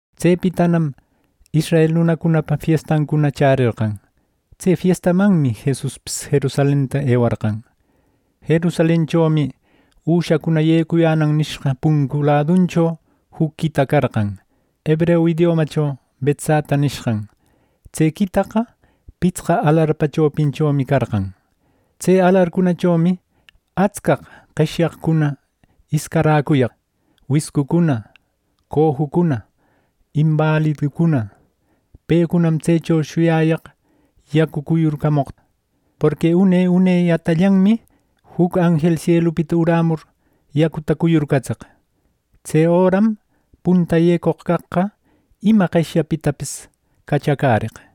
Tsepitanam israel nunacunapa fiestancuna chärerqan. Tse fiestamanmi Jesuspis Jerusalenta ewarqan. Jerusalenchomi “üshacuna yecuyänan” nishqan puncu laduncho juc quita carqan, hebreu idiomacho Betzata nishqan. Tse quitaqa pitsqa alarpa chopinchomi carqan. Tse alarcunachomi atscaq qeshyaqcuna iscaräcuyaq: wiscucuna, cojucuna, inbaliducuna. ˻Pecunam tsecho shuyayaq yacu cuyurcamoqta. Porqui une unellatayanmi juc anjel sielupita urämur, yacuta cuyurcatseq. Tse öram punta yecoq caqqa ima qeshyapitapis cachacäreq.˼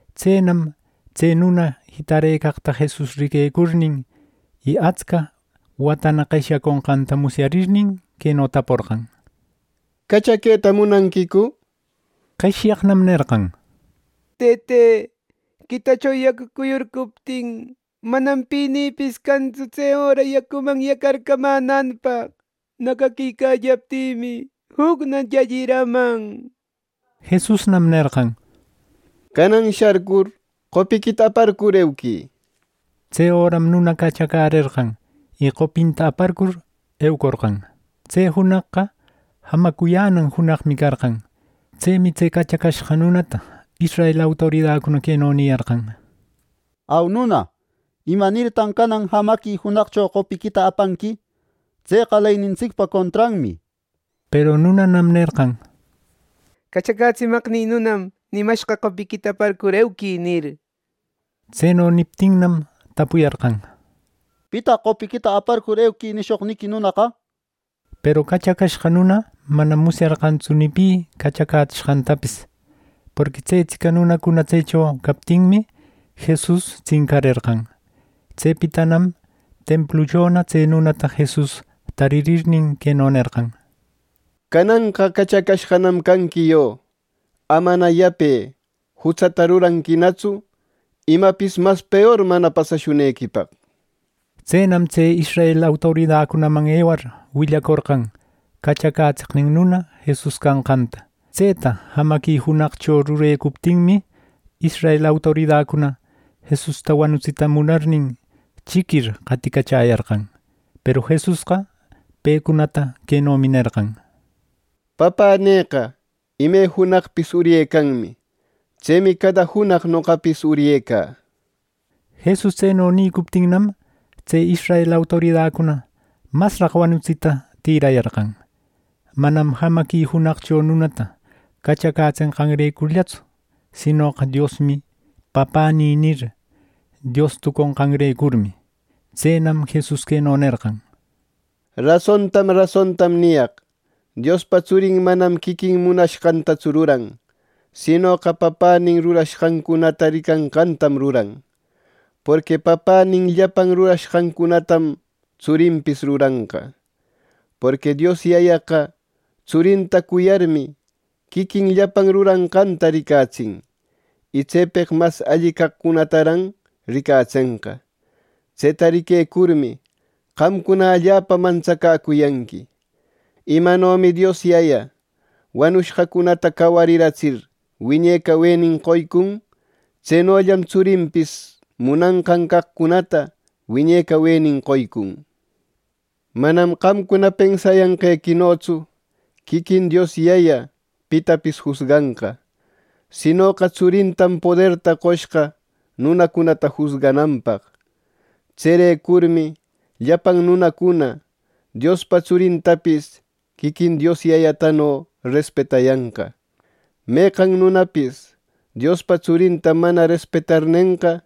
Tsenam tse nuna jitarëcaqta Jesus riquecurnin, y atsca watana qeshyaconqanta musyarirnin, queno taporqan: —¿Cachaqueta munanquicu? —nishpa. Qeshyaqnam nerqan: —Tëte, quitacho yacu cuyurcuptin, manam pinïpis cantsu tse öra yacuman yacarcamänanpaq. Nacaquicallaptïmi, jucna llalliraman —nir. Jesusnam nerqan: —Canan sharcur, qopiquita aparcur euquï —nishpa. Tse öram nuna cachacärerqan, y qopinta aparcur, eucorqan. Tse junaqqa jamacuyänan junaqmi carqan. Tsemi tse cachacashqa nunata israel autoridacuna queno niyarqan: —¡Au nuna! ¿Imanirtan canan jamaqui junaqcho qopiquita apanqui! Tseqa leynintsicpa contranmi —nir. Peru nunanam nerqan: —Cachacätsimaqnï nunam nimashqa: ‘Qopiquita aparcur euquï’ —nir. Tseno niptinnam tapuyarqan: —¿Pitaq ‘Qopiquita aparcur euquï’ nishoqniqui nunaqa? —nir. Peru cachacashqa nuna manam musyarqantsu ni pi cachacätsishqantapis, porqui tsetsica nunacuna tsecho captinmi, Jesus tsincarerqan. Tsepitanam templuchona tse nunata Jesus taririrnin, queno nerqan: —¡Cananqa cachacashqanam canqui yo! Amana yape jutsata ruranquinatsu imapis mas peor mana pasashunequipaq. Tsenam tse israel autoridacunaman ewar, willacorqan cachacätseqnin nuna Jesus canqanta. Tseta jamaqui junaqcho rurecuptinmi, israel autoridacuna Jesusta wanutsita munarnin chiquir qaticachäyarqan. Peru Jesusqa pecunata quenomi nerqan: —Papänïqa ime junaqpis uryecanmi. Tsemi cada junaq noqapis uryecä —nir. Jesus tseno nicuptinnam, tse israel autoridacuna masraq wanutsita tïrayarqan, manam jamaqui junaqcho nunata cachacätsenqanrecurllatsu, sinoqa “Diosmi Papänï” nir, Dios tuconqanrecurmi. Tsenam Jesus queno nerqan: “Rasontam rasontam niyaq. Diospa Tsurin manam quiquin munashqantatsu ruran, sinoqa Papänin rurashqancunata ricanqantam ruran. Porqui Papänin llapan rurashqancunatam tsurinpis ruranqa. Porqui Dios Yayaqa Tsurinta cuyarmi, quiquin llapan ruranqanta ricatsin. Y tsepeq mas alli caqcunataran ricatsenqa. Tseta riquecurmi, qamcuna allapa mantsacäcuyanqui. Imanomi Dios Yaya wanushqacunata cawariratsir, wiñe cawenin qoycun, tsenollam Tsurinpis munanqan caqcunata wiñe cawenin qoycun. Manam qamcuna pensayanqequinotsu quiquin Dios Yaya pitapis jusganqa, sinoqa Tsurintam poderta qoshqa nunacunata jusgananpaq. Tserecurmi llapan nunacuna Diospa Tsurintapis quiquin Dios Yayatano respetayanqa. Meqan nunapis Diospa Tsurinta mana respetarnenqa,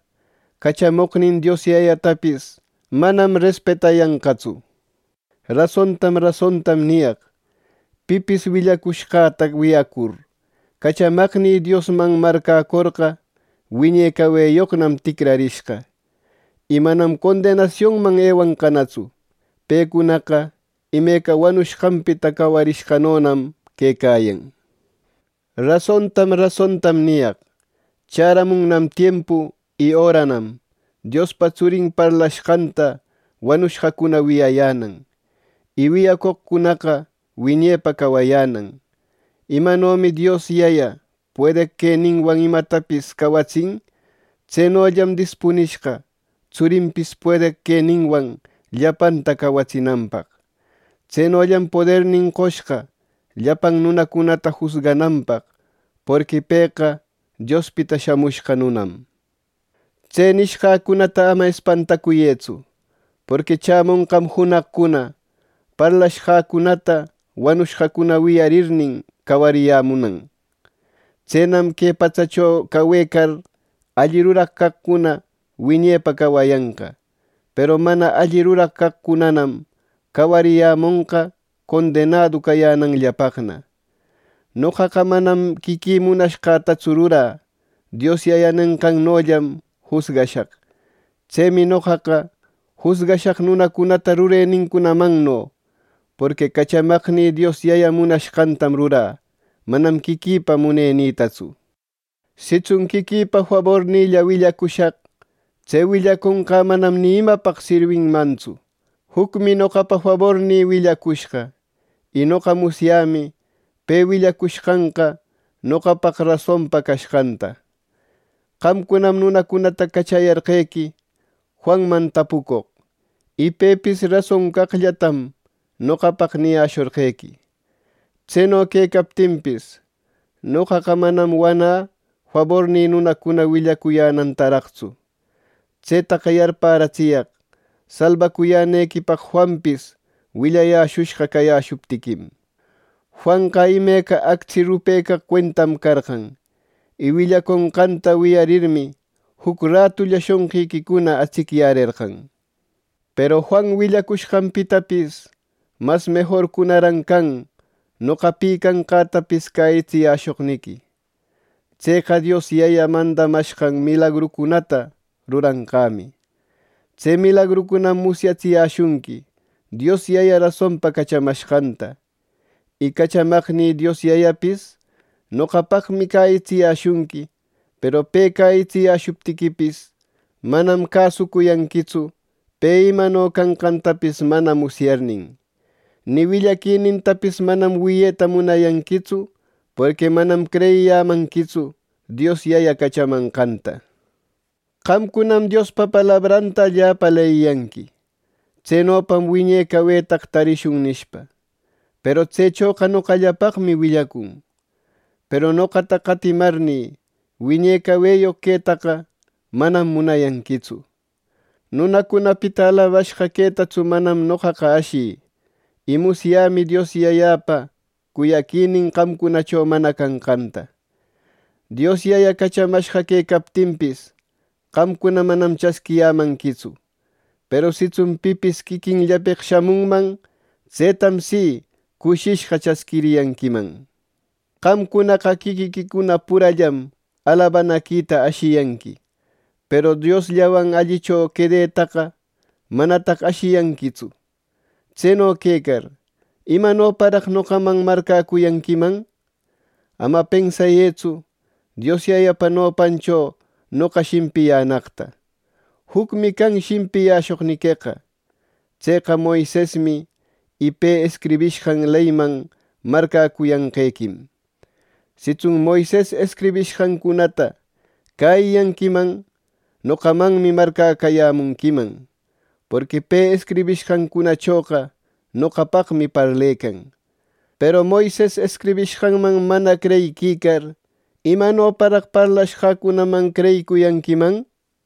cachamoqnin Dios Yayatapis manam respetayanqatsu. “Rasontam rasontam niyaq. Pipis willacushqäta wiyacur, cachamaqnï Diosman marcäcorqa, wiñe caweyoqnam ticrarishqa, y manam condenasiunman ewanqanatsu. Pecunaqa imeca wanushqanpita cawarishqanonam quecayan. Rasontam rasontam niyaq. Chäramunnam tiempu y öranam Diospa tsurin parlashqanta wanushqacuna wiyayänan, y wiyacoqcunana wiñepa cawayänan. Imanomi Dios Yaya puedeq queninwan imatapis cawatsin, tsenollam dispunishqa Tsurinpis puedeq queninwan llapanta cawatsinanpaq. Tsenollam podernin qoshqa llapan nunacunata jusgananpaq, porqui pëqa Diospita Shamushqa Nunam. Tse nishqäcunata ama espantacuyëtsu, porqui chämonqam junaqcuna parlashqäcunata wanushqacuna wiyarirnin, cawariyämunan. Tsenam que patsacho cawecar, alli ruraq caqcuna wiñepaq cawayanqa; peru mana alli ruraq caqcunanam, cawariyämonqa condenadu cayänanllapaqna. “Noqaqa manam quiquï munashqätatsu rurä. Dios Yayä nenqannollam jusgashaq. Tsemi noqaqa jusgashaq nunacunata rurenincunamanno, porqui cachamaqnï Dios Yaya munashqantam rurä, manam quiquïpa munenïtatsu. Sitsun quiquïpa fabornïlla willacushaq, tse willaconqä manam ni imapaq sirwinmantsu. Jucmi noqapa fabornïqa willacushqa, y noqa musyämi pe willacushqanqa noqapaq rasonpa cashqanta. Qamcunam nunacunata cachayarqequi Juanman tapucoq, y pepis rason caqllatam noqapaq niyäshorqequi. Tseno quecaptinpis, noqaqa manam wanä fabornï nunacuna willacuyänantaraqtsu. Tsetaqa yarparatsiyaq salbacuyänequipaq ˻Juanpis willayäshushqa cayäshuptiquim˼. Juanqa imeca actsi rupecaq cuentam carqan, y willaconqanta wiyarirmi, juc ratulla shonqiquicuna atsicyärerqan. Peru Juan willacushqanpitapis mas mejorcunaran can noqa pi canqätapis cäyitsiyäshoqniqui. Tseqa Dios Yaya mandamashqan milagrucunata ruranqämi. Tse milagrucunam musyatsiyäshunqui Dios Yaya rasonpa cachamashqanta. Y cachamaqnï Dios Yayapis noqapaqmi cäyitsiyäshunqui, peru pe cäyitsiyäshuptiquipis, manam cäsuyanquitsu, pe imano canqantapis mana musyarnin. Ni willaquinintapis manam wiyeta munayanquitsu, porqui manam creyiyämanquitsu Dios Yayä cachamanqanta Qamcunam Diospa palabranta allapa leyiyanqui, ‘Tsenopam wiñe cawetaqa tarishun’ nishpa. Peru tsechoqa noqallapaqmi willacun. Peru noqata qatimarnï wiñe caweyoq quetaqa, manam munayanquitsu. “Nunacunapita alabashqa quetatsu manam noqaqa ashï. Y musyämi Dios Yayäpa cuyaquinin qamcunacho mana canqanta. Dios Yayä cachamashqa quecaptinpis, qamcuna manam chasquiyämanquitsu. Peru sitsun pipis quiquinllapeq shamunman, tsetam si cushishqa chasquiriyanquiman. Qamcunaqa quiquiquicuna purallam alabanaquita ashiyanqui, peru Diosllawan allicho quedetaqa manataq ashiyanquitsu. Tseno quecar, ¿Imanoparaq noqaman marcäcuyanquiman? Ama pensayëtsu Dios Yayapa nopancho noqa shimpiyänaqta. Jucmi can shimpiyäshoqniqueqa: tseqa Moisesmi, y pe escribishqan leyman marcäquicayanqequim. Sitsun Moises escribishqancunata cäyiyanquiman, noqamanmi marcäcuyanquiman, porqui pe escribishqancunachoqa noqapaqmi parlecan. Peru Moises escribishqanman mana creyiquicar, ¿imanoparaq parlashqäcunaman creyicuyanquiman?” nir.